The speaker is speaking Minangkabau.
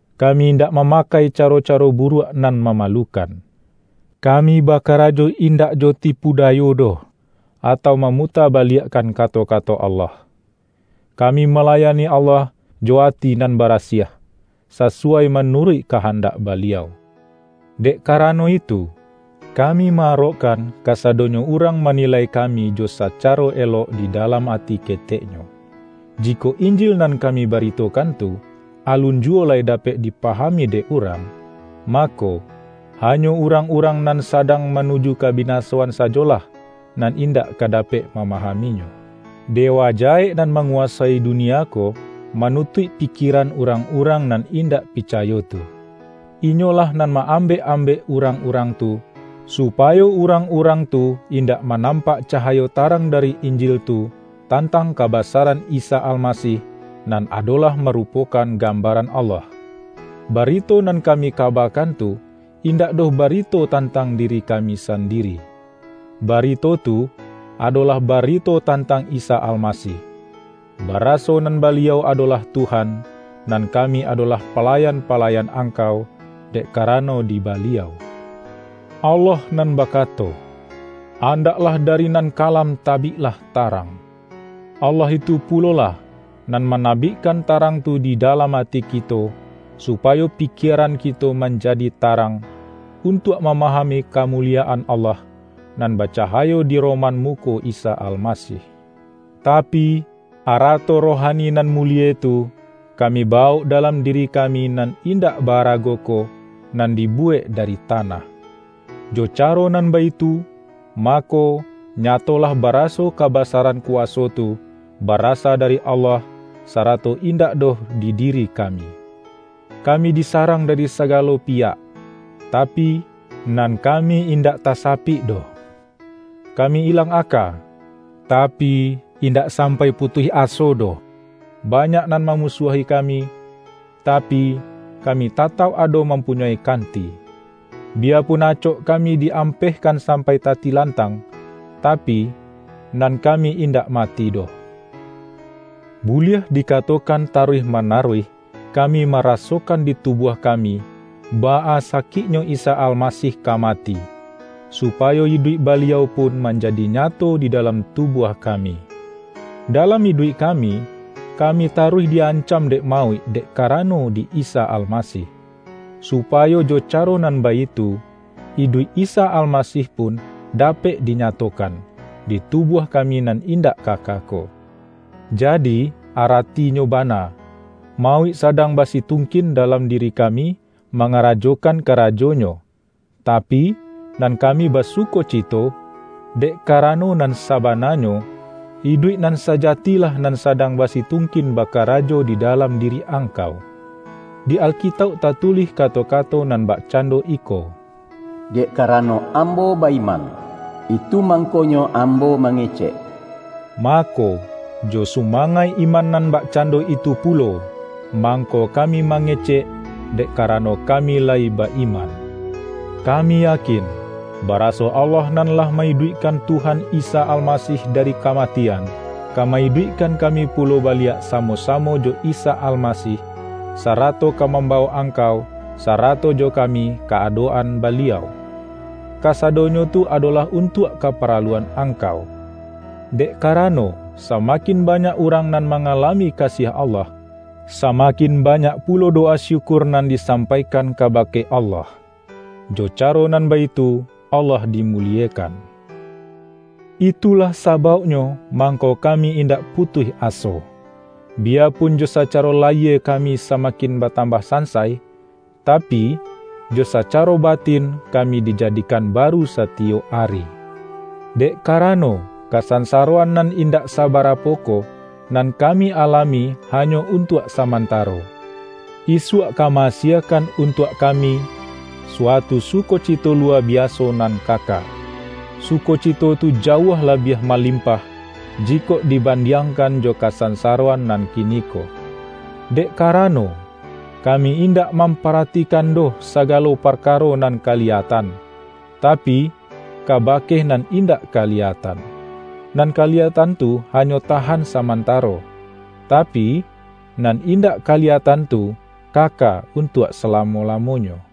Ka-mi indak mamakai caro-caro buruak nan mamalukan. Kami bakarajo indak jo tipu dayo doh, atau mamuta-baliak-kan kato-kato Allah. Kami malayani Allah jo ati nan barasiah, sasuwai ma-nuruik kahandak Baliau. Dek kara-no itu, kami ma-arokkan kasadonyo urang manilai kami jo sacaro elok di dalam ati keteknyo. Jikok Injil nan kami baritokan tu, alun juwo lai da-pek dipahami dek urang, mako, ha-nyo urang-urang nan sadang manuju kabinasoan sajolah, nan indak ka da-pek mamahaminyo. Dewa jahek nan manguwasoi dunia ko, manutuik pikie-ran urang-urang nan indak picayo tu. Inyolah nan ma-ambek-ambek urang-urang tu, supayo urang-urang tu in-dak manampak cahayo tarang dari In-jil tu, tantang kabasaran Isa Almasih, nan adolah marupokan gambaran Allah. Barito nan kami kabakan tu, indak doh barito tantang diri kami sandiri. Barito tu, adolah barito tan-tang Isa Almasih; baraso nan Baliau adolah Tuhan; nan kami adolah pa-layan-palayan angkau, dek karano di Baliau. Allah nan bakato, ’Andaklah dari nan kalam tabiklah tarang,” Allah itu pulolah, nan manabikkan tarang tu di dalam ati kito, supayo pikieran kito manjadi tarang, untuak mama-hami kamuliyaan Allah, nan bacaha-yo di roman muko Isa Almasih. Tapi, arato rohani nan mulie tu, kami bawok dalam diri kami nan in-dak ba-arago ko, nan dibuwek dari tanah. Jo caro nan baitu, mako, nya-tolah baraso kabasaran kuwaso tu, ba-rasa dari Allah, sarato indak doh di diri kami. Kami disarang dari saga-lo piyak, tapi, nan kami indak tasapik doh. Kami ilang aka, tapi, indak sam-pai putuih aso doh. Banyak nan ma-musuahi kami, tapi, kami tatauk ado mampunyoi kanti. Biyapun acok kami di-ampehkan sampai tatilantang, ta-pi, nan kami indak mati doh. Buliah dikatokan taruih manaruih kami ma-rasokan di tubuah kami, baa sakiknyo Isa Almasih ka mati, supayo iduik Ba-liau pun manjadi nyato di dalam tu-buah kami. Dalam iduik kami, ka-mi taruih di-ancam dek mauik dek karano di Isa Almasih, supayo jo caro nan baitu, iduik Isa Almasih pun da-pek dinyatokan, di tubuah kami nan indak kaka ko. Jadi, aratinyo bana, mauik sadang basitungkin dalam di-ri kami mangarajokan karajonyo, tapi, nan kami basukocito, dek karano nan sabananyo, iduik nan sajatilah nan sadang basitungkin bakarajo di dalam diri angkau. Di Alkitauk tatulih kato-kato nan bakcando iko,”Dek karano ambo ba-iman, itu mangkonyo ambo mange-cek.” Mako, jo sumangaik iman nan bakcando itu pulo, mangko kami ma-ngecek, dek karano kami layi ba-iman. Kami yakin, baraso Allah nan lah ma-iduikkan Tuhan Isa Almasih dari kamatian, ka ma-iduikkan kami pulo baliak samo-samo jo Isa Almasih, sa-rato ka mambawok angkau sarato jo kami ka adok-an Baliau. Kasadonyo tu adolah untuak kaparaluan angkau. Dek karano, samakin banyak urang nan mangalami kasiah Allah, sama-kin banyak pulo dowa syukur nan di-sampaikan kabake Allah; jo caro nan baitu Allah dimuliekan. Itulah sabauknyo mangko kami indak putuih aso. Biyapun jo sacaro layie kami samakin batambah san-sai, tapi, jo sacaro batin kami dija-dikan baru satiyok ari. Dek kara-no, kasansaroan nan indak sabarapo ko, nan kami alami hanyo untuak sa-mantaro, isuak ka ma-asiekan untuak kami, suatu sukocito luwa biaso nan kaka. Sukocito tu jauah labiah ma-limpah, jikok dibandiangkan jo ka-sansaroan nan kiniko. Dek karano, kami indak mamparatikan doh saga-lo parkaro nan kaliyatan, tapi, kaba-ke nan indak kaliyatan. Nan kaliya-tan tu hanyo tahan samantaro, tapi, nan indak kaliyatan tu, kaka untuak salamo-lamonyo.